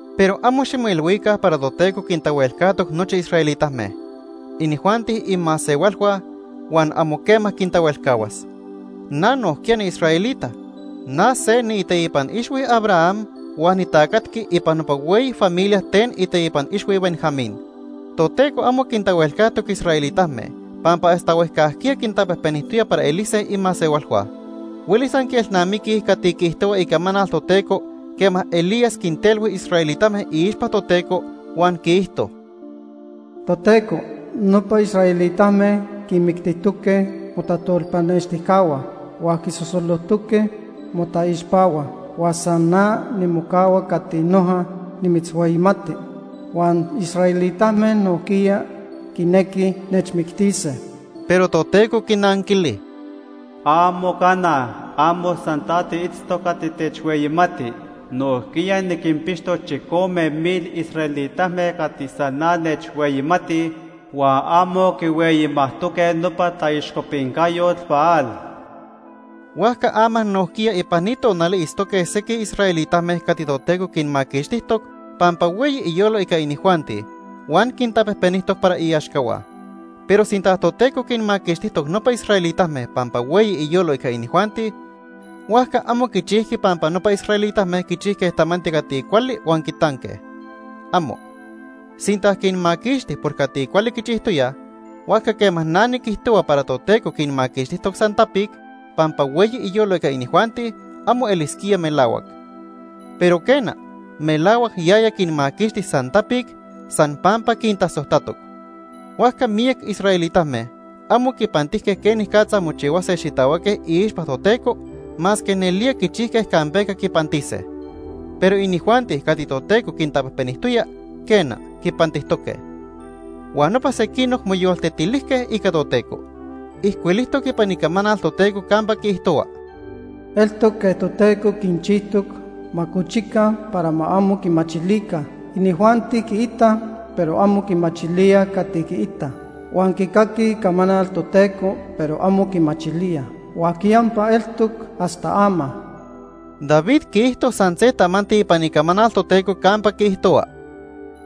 Pero amo ximoilhuica para Toteco quintahuelcajtoc nochi israelitame. Inijuanti imasehualhua, huan amo quema quintahuelcahuas. Na nojquiya niisraelita. Na se niiteipan ixhui Abraham huan nitacatqui ipan nopa hueyi familia ten iteipan ixhui Benjamín. Toteco amo quintahuelcajtoc israelitame pampa hasta huejcajquiya quintapejpenijtoya para elise imasehualhua. Huelis anquielnamiquij cati quiijtohua Icamanal Toteco quema Elías quintelhui israelitame iixpa Toteco, huan quiijto: “Toteco, nopa israelitame quinmictijtoque motajtolpanextijcahua huan quisosolojtoque motaixpahua. Huan san na nimocahua cati noja nimitzhueyimati huan israelitame nojquiya quinequij nechmictise.” Pero Toteco quinanquili: “¡Amo cana! Amo san ta tiitztoc cati techhueyimati. Nojquiya niquinpixtoc chicome mil israelitame cati san na nechhueyimatij huan amo quihueyimajtoque nopa taixcopincayot Baal.” Huajca ama nojquiya ipan ni tonali itztoque sequij israelitame cati Toteco quinmaquixtijtoc pampa hueyi iyolo ica inijuanti huan quintapejpenijtoc para iaxcahua. Pero sinta Toteco quinmaquixtijtoc nopa israelitame pampa hueyi iyolo ica inijuanti, huajca amo quichijqui pampa nopa israelitame quichijque tamanti cati cuali huan quitanque. ¡Amo! Sinta quinmaquixti por cati cuali quichijtoyaj, huajca quema na niquijtohua para Toteco quinmaquixtijtoc san tapic, pampa hueyi iyolo ica inijuanti, amo elisquía melahuac. Pero quena, melahuac yaya quinmaquixti san tapic, san pampa quintasojtatoc. Huajca miyac israelitame amo quipantijque quenicatza mochihuase xitahuaque iixpa Toteco, masque nelía quichijque campeca quipantise. Pero inijuanti cati Toteco quintapejpenijtoya, quena, quipantijtoque. Huan nopa sequinoc moyoltetilijque ica Toteco. Ijcuilijtoc ipan Icamanal Toteco campa quiijtohua: “Eltoc quej Toteco quinchijtoc ma cochica para ma amo quimachilica. Inijuanti quiitaj, pero amo quimachilíaj cati quiitaj, huan quicaquij Icamanal Toteco, pero amo quimachilíaj, huan quiyampa eltoc hasta ama.” David quiijto san se tamanti ipan Icamanal Toteco campa quiijtohua: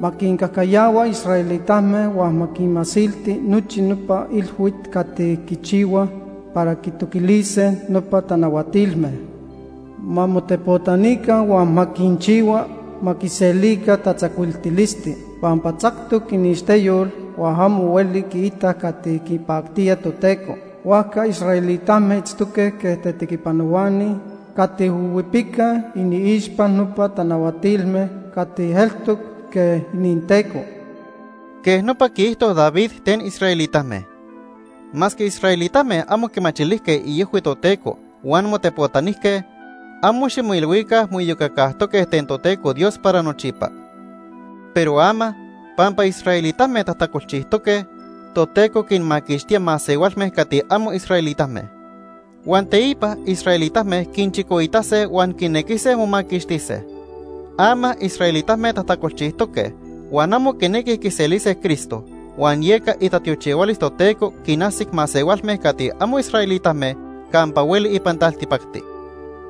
“Ma quincajcayahua israelitame huan ma quinmasilti nochi nopa ilhuit cati quichihuaj para quitoquilise nopa tanahuatilme. Ma motepotanica huan ma quinchihua ma quiselica tatzacuiltilisti. Pampa tzactoc iniixteyol huan amo hueli quiitaj cati quipactía Toteco. Huajca israelitame itztoque quej tetequipanohuani cati huihuipicaj iniixpa nopa tanahuatilme cati eltoc quej ininteco.” Quej nopa quiijto David ten israelitame. Masque israelitame amo quimachilijque iojhui Toteco huan motepotanijque, amo ximoilhuica moiyocacajtoque ten Toteco Dios para nochipa. Pero ama, pampa israelitame tajtacolchijtoque, Toteco quinmaquixtía masehualme cati amo israelitame. Huan teipa israelitame quinchicoitase huan quinequise momaquixtise. Ama israelitame tajtacolchijtoque huan amo quinequij quiselise Cristo huan yeca itatiochihualis Toteco quinajsic masehualme cati amo israelitame campa hueli ipan taltipacti.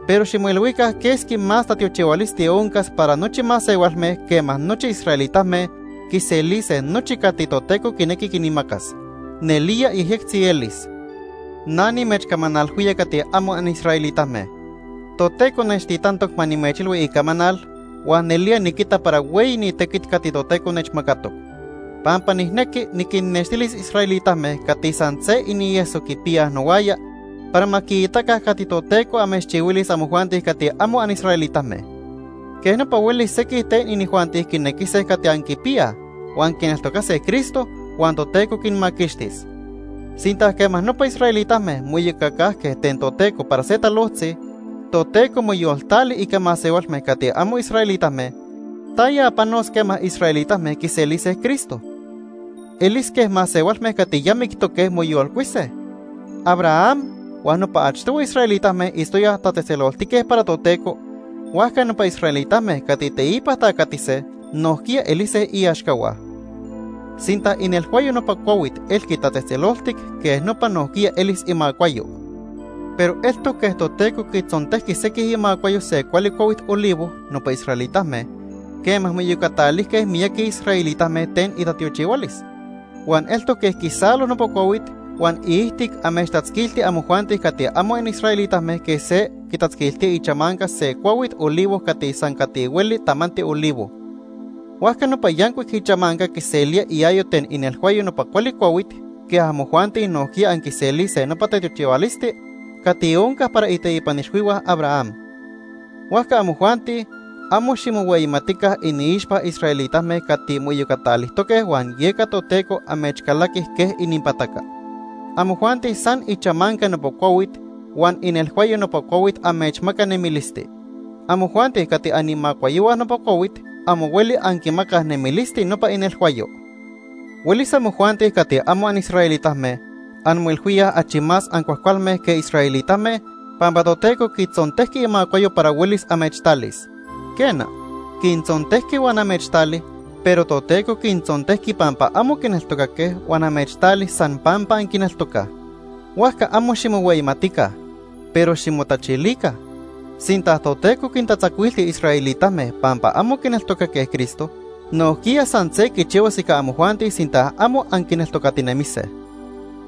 Pero ximoilhuica quesqui más tatiochihualisti oncas para nochi masehualme quema nochi israelitame quiselise nochi cati Toteco quinequi quinmacas. Nelía yejyectzi elis. Na nimechcamanalhuía cati amo anisraelitame. Toteco nechtitantoc ma nimechilhui Icamanal huan nelía niquita para hueyi ni tequit cati Toteco nechmacatoc. Pampa nijnequi niquinnextilis israelitame cati san se inieso quipiyaj nohuaya para ma quiitaca cati Toteco amechchihuilis amojuanti cati amo anisraelitame. Quej nopa huelis sequij ten inijuanti quinequise cati anquipiyaj, huan quineltocase Cristo, huan Toteco quinmaquixtis. Sinta quema nopa israelitame moiyocacajque ten Toteco para se talojtzi, Toteco moyoltali ica masehualme cati amo israelitame, ¿taya panos quema israelitame quiselise Cristo? Elis quej masehualme cati ya mictoque moyolcuise. Abraham huan nopa achtohui israelitame itztoyaj tatzejtzeloltique para Toteco, huajca nopa israelitame cati teipa tacatise nojquiya elise iaxcahua. Sinta inelhuayo nopa cuahuit elqui tatzejtzeloltic, quej nopa nojquiya elis imacuayo. Pero eltoc quej Toteco quitzontejqui sequij imacuayo se cuali cuahuit olivo, nopa israelitame, quema moiyocatalijque miyaqui israelitame ten itatiochihualis. Huan eltoc quej quisalo nopa cuahuit huan iijtic amechtatzquilti amojuanti cati amo anisraelitame quej se quitatzquiltía ichamanca se cuahuit olivo cati san cati hueli tamanti olivo. Huajca nopa yancuic ichamanca quiselía iayo ten inelhuayo nopa cuali cuahuit, quej amojuanti nojquiya anquiselise nopa tatiochihualisti cati onca para iteipan ixhuihua Abraham. Huajca amojuanti, amo ximohueyimatica iniixpa israelitame cati moiyocatalijtoque huan yeca Toteco amechcalaqui quej ininpataca. Amojuanti san ichamanca nopa cuahuit huan inelhuayo nopa cuahuit amechmaca nemilisti. Amojuanti cati animacuayohua nopa cuahuit amo hueli anquimacaj nemilisti nopa inelhuayo. Huelis amojuanti cati amo anisraelitame anmoilhuíaj achi más ancuajcualme que israelitame pampa Toteco quitzontejqui imacuayo para huelis amechtalis. Quena, quintzontejqui huan amechtali, pero Toteco quintzontejqui pampa amo quineltocaque huan amechtali san pampa anquineltocaj. Huajca amo ximohueyimatica, pero ximotachilica. Sinta Toteco quintatzacuilti israelitame pampa amo quineltocaque Cristo, nojquiya san se quichihuas ica amojuanti sinta amo anquineltocatinemise.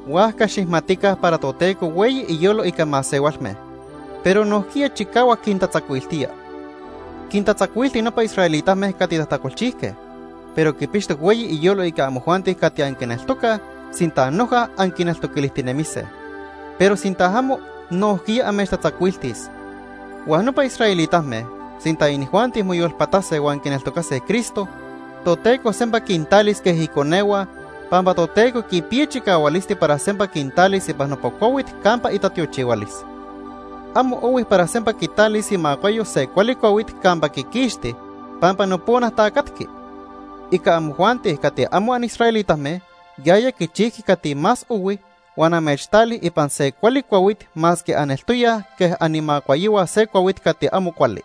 Huajca xijmatica para Toteco hueyi iyolo ica masehualme, pero nojquiya chicahuac quintatzacuiltía. Quintatzacuilti nopa israelitame cati tajtacolchijque, pero quipixtoc hueyi iyolo ica amojuanti cati anquineltocaj sinta noja anquineltoquilijtinemise. Pero sinta amo, nojquiya amechtatzacuiltis. Huan nopa israelitame, sinta inijuanti moyolpatase huan quineltocase Cristo, Toteco sempa quintalis quej iconehua pampa Toteco quipiya chicahualisti para sempa quintalis ipan nopa cuahuit campa itatiochihualis. Amo ohui para sempa quitalis imacuayo se cuali cuahuit campa quiquixti pampa nopona tacatqui. Ica amojuanti cati amo anisraelitame, yaya quichijqui cati más ohui huan amechtali ipan se cuali cuahuit masque aneltoyaj quej animacuayohua se cuahuit cati amo cuali.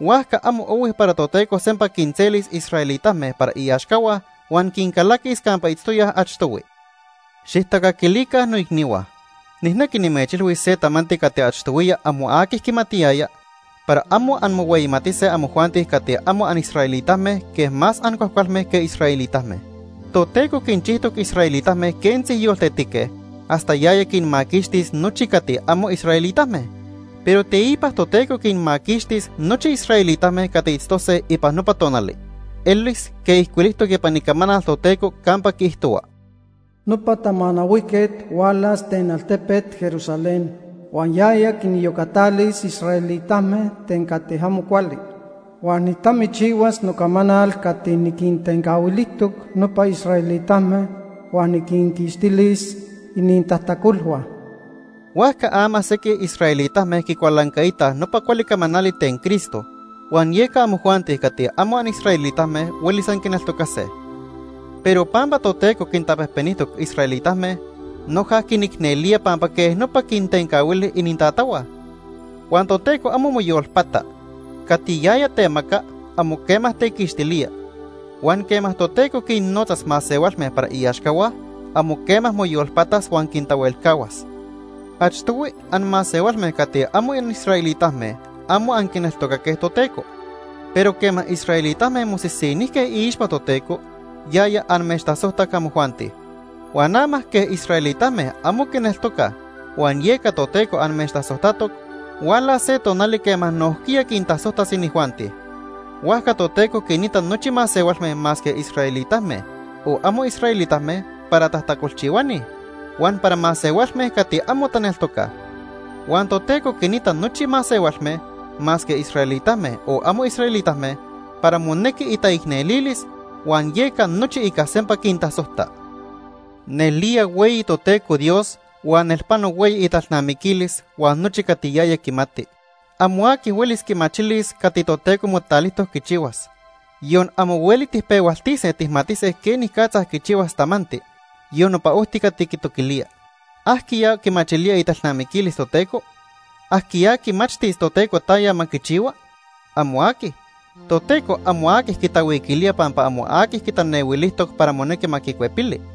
Huajca amo ohui para Toteco sempa quinselis israelitame para iaxcahua huan quincalaquis campa itztoyaj achtohui. Xijtacaquilica noicnihua, nijnequi nimechilhuis se tamanti cati achtohuiya amo aqui quimatiyaya para amo anmohueyimatise amojuanti cati amo anisraelitame quej más ancuajcualme que israelitame. Toteco quinchijtoc israelitame quentzi yoltetique hasta yaya quinmaquixtis nochi cati amo anisraelitame. Pero teipa Toteco quinmaquixtis nochi israelitame cati itztose ipan nopa tonali. Elis quej ijcuilijtoc ipan Icamanal Toteco campa quiijtohua: “Nopa Tamanahuijquet hualas ten altepet Jerusalén Altepet Jerusalén nojquiya itoca Sion.. Huan yaya quiniyocatalis israelitame ten cati amo cuali. Huan nijtamichihuas nocamanal cati niquintencahuilijtoc nopa israelitame huan niquinquixtilis inintajtacolhua.” Huajca ama sequij israelitame quicualancaitaj nopa cuali camanali ten Cristo, huan yeca amojuanti cati amo anisraelitame huelis anquineltocase. Pero pampa Toteco quintapejpenijtoc israelitame, noja quinicnelía pampa quej nopa quintencahuili inintatahua. Huan Toteco amo moyolpata. Cati yaya temaca, amo quema tequixtilía. Huan quema Toteco quinnotzas masehualme para iaxcahua, amo quema moyolpatas huan quintahuelcahuas. Achtohui anmasehualme cati amo anisraelitame amo anquineltocaque Toteco, pero quema israelitame mosisinijque iixpa Toteco, yaya amechtasojtac amojuanti. Huan ama quej israelitame amo quineltocaj huan yeca Toteco amechtasojtatoc, hualas se tonali quema nojquiya quintasojtas inijuanti. Huajca Toteco quinita nochi masehualme masque israelitame o amo israelitame para tajtacolchihuani, huan para masehualme cati amo taneltocaj. Huan Toteco quinita nochi masehualme, masque israelitame o amo israelitame, para monequi itaicnelilis, huan yeca nochi ica sempa quintasojta. Nelía hueyi Toteco Dios huan nelpano hueyi italnamiquilis huan nochi cati yaya quimati. Amo aqui huelis quimachilis cati Toteco motalijtoc quichihuas. Yon amo hueli tijpehualtise tijmatise quenicatza quichihuas tamanti, yon nopa ojti cati quitoquilía. ¿Ajquiya quimachilía italnamiquilis Toteco? ¿Ajquiya quimachtis Toteco taya ma quichihua? ¡Amo aqui! Toteco amo aqui quitahuiquilía pampa amo aqui quitanehuilijtoc para monequi ma quicuepili.